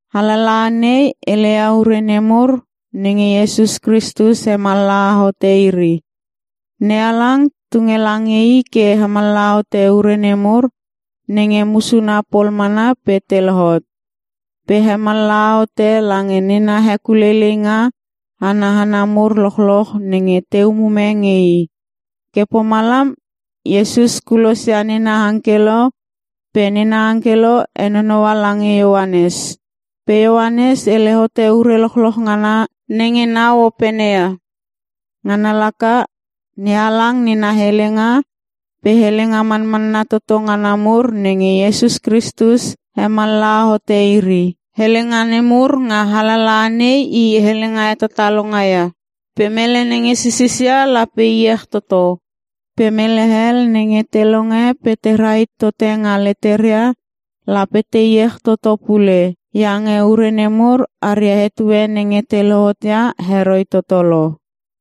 Alalaha nei heleia ure nemur nenge Iesus Kristus hemallaha hote iri. NeHalang tunge lange I ke hemallaha hote ure nemur nenge musuna pol mana pe te lohot. Pe hemallaha hote lange nena hekuleileinga ana hana mur lochloch nenge te umume nge I. Ke pomalam Iesus kulosia nena angkelo pe nena angkelo henonoua lange Ioanes. Pe Ioanes hele hote ure lochloch ngana nenge nau opene ia. Ngana laka: NeHalang nena helenga pe helenga manmanna toto ngana mur nenge Iesus Kristus hemallaha hote iri. Helenga nemur nga alalaha nei i helenga hetatalonga ia. Pe mele nenge sisisia lape iech toto, pe mele hel nenge te longe pe te rahit tote nga leteria, lape te iech toto pule. Iange ure nemur aria etue nenge te lohot ia heroi toto lo.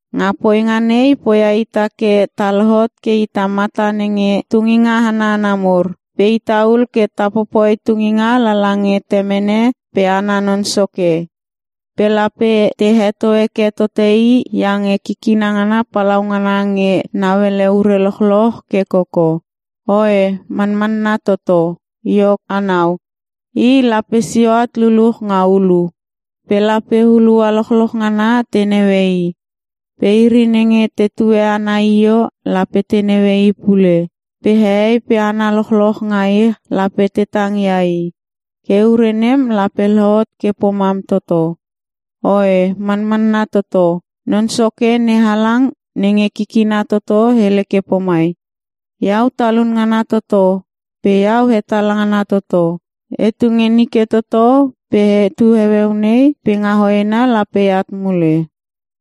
Nga poinga nei poia ita ke ta lohot ke ita mata nenge tunginga ana hana mur, pe ita ul ke ta popoi tunginga lala nge Temene pe ana Non Soke. Pe lape te heto heke tote I iange kikina ngana palaungana nge nauele ure lochloch ke koko. Oe, Manmanna Toto! Iok anau, I lape sio at luluch nga ulu, pe lape hulua lochloch ngana te naue I. Pe iri nenge tetue I nga io lape te naue I pule. Pe hehei pe hana lochloch nga ich lape te tangia I. Ke ure nem lape lohot ke pomam toto. Oe Manmanna Toto! Non Soke NeHalang nenge Kikina Toto hele ke pomai, “Iau Talun ngana Toto pe Iau Hetala ngana Toto. Etu nge nike toto pe etu heueu nei pe nga hoena lape eat mule.”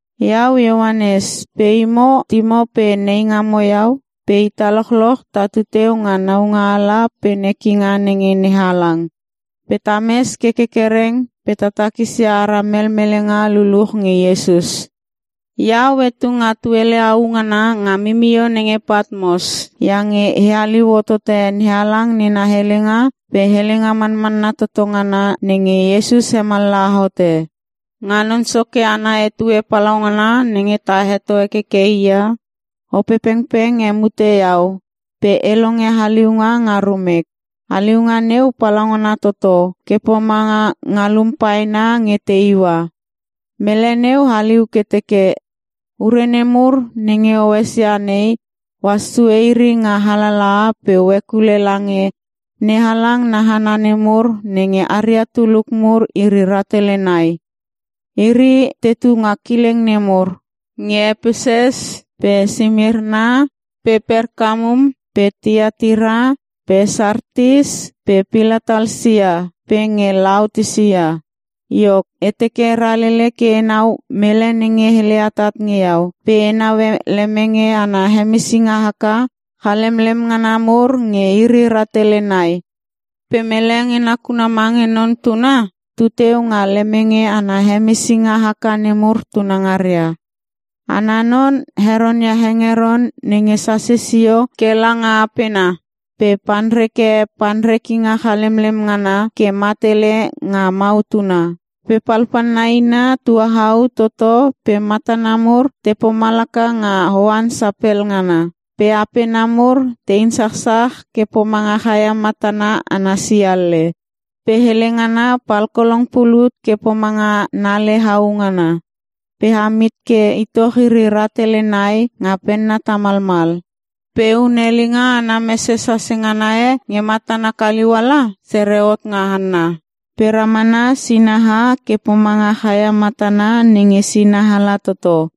Iau Ioanes, pe imo timo pe neingamo iau pe ita lochloch tatu teu nga naualanga pe nekinga nenge NeHalang. Pe tames ke kerkereng pe ta takisia ara melmelenga luluch nge Iesus. Iau etu nga tuele au ngana nga mimio nenge Patmos iange e haliu hotote NeHalang nena helenga pe helenga manmanna toto ngana nenge Iesus hemallaha hote. Nga Non Soke ana etue palaungana nenge ta heto hekeke I ia, Opepengpeng hemute iau pe e longe haliunga nga rumek. Haliunga neu palaungana toto ke pomanga ngalum paena nge te iua. Mele neu haliu ke teke, “Ure nemur nenge o esia nei ohas sue iri nga alalaha pe o hekule lange NeHalang na hana nemur nenge aria tuluk mur iri rahtele nai. Iri tetu nga kileng nemur: Nge Epesus pe Simirna pe Perkamum pe Tiatira pe Sartis pe Pilatalsia pe nge Laotisia.” Iok, e teke e ralele ke enau mele nenge hele atat nge iau pe e naue lemenge ana hemesinga haka chalemlem ngana mur nge iri rahtele nai. Pe mele nge nakuna mange Non Tuna tuteu nga lemenge ana hemesinga haka nemur tunangaria. Ana non heronia hengeron nenge sase sio ke langa apena pe panreke panrekinga chalemlem ngana ke matele nga mautuna. Pe palpalna ina tuahau toto pe matana mur te pomalaka nga oan sapel ngana. Pe apena mur te insachsach ke pomanga chaia matana ana sialle. Pe hele ngana palkolong pulut ke pomanga nale hau ngana. Pe am hit ke itoch iri rahtele nai nga penna tamalmal. Pe hunelinga ana mese sase ngana e nge matana kaliuala, sere hot nga hanna. Pe ramana sinaha ke pomanga chaia matana nenge sinaala toto.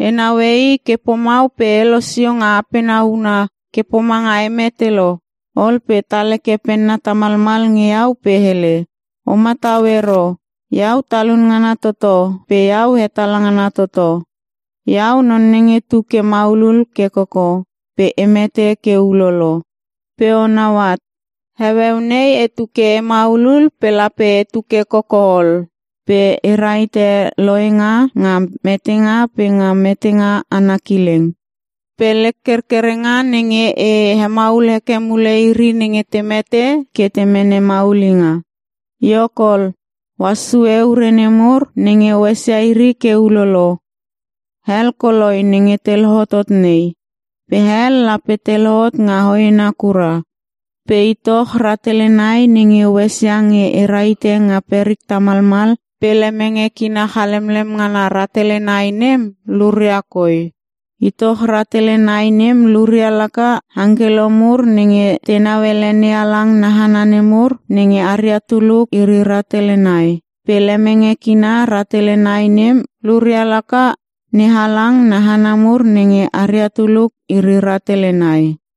E naue I ke pomau pe e losio nga apena huna ke pomanga e mete lo. Ol pe tal heke penna tamalmal nge iau pe hele, “O matau ero! Iau Talun ngana toto pe Iau Hetala ngana toto. Iau non nenge tu ke maulul ke koko pe e mete ke ulolo. Pe onau at, heueu nei etu ke e maulul pe lape etu ke koko ol. Pe e rahite lohenga nga metenga pe nga metenga ana kileng. Pe lek kerkerenga nenge e hemaul heke mule iri nenge te mete ke te mene maulinga. “Iok ol, ohas sue ure nemur nenge o esia iri ke ulolo. Hel koloi nenge te lohotot nei. Pe hel lape te lohot nga hoena kura. Pe itoch rahtele nai nenge o esia nge e rahite nga perik tamalmal pe lemenge kina chalemlem ngana rahtele nai nem luria koi. Itoch rahtele nai nem luria laka; angkelo mur nenge tenau ele NeHalang na hana nemur nenge aria tuluk iri rahtele nai. Pe lemenge kina rahtele nai nem luria laka; NeHalang na hana mur nenge aria tuluk iri rahtele nai.”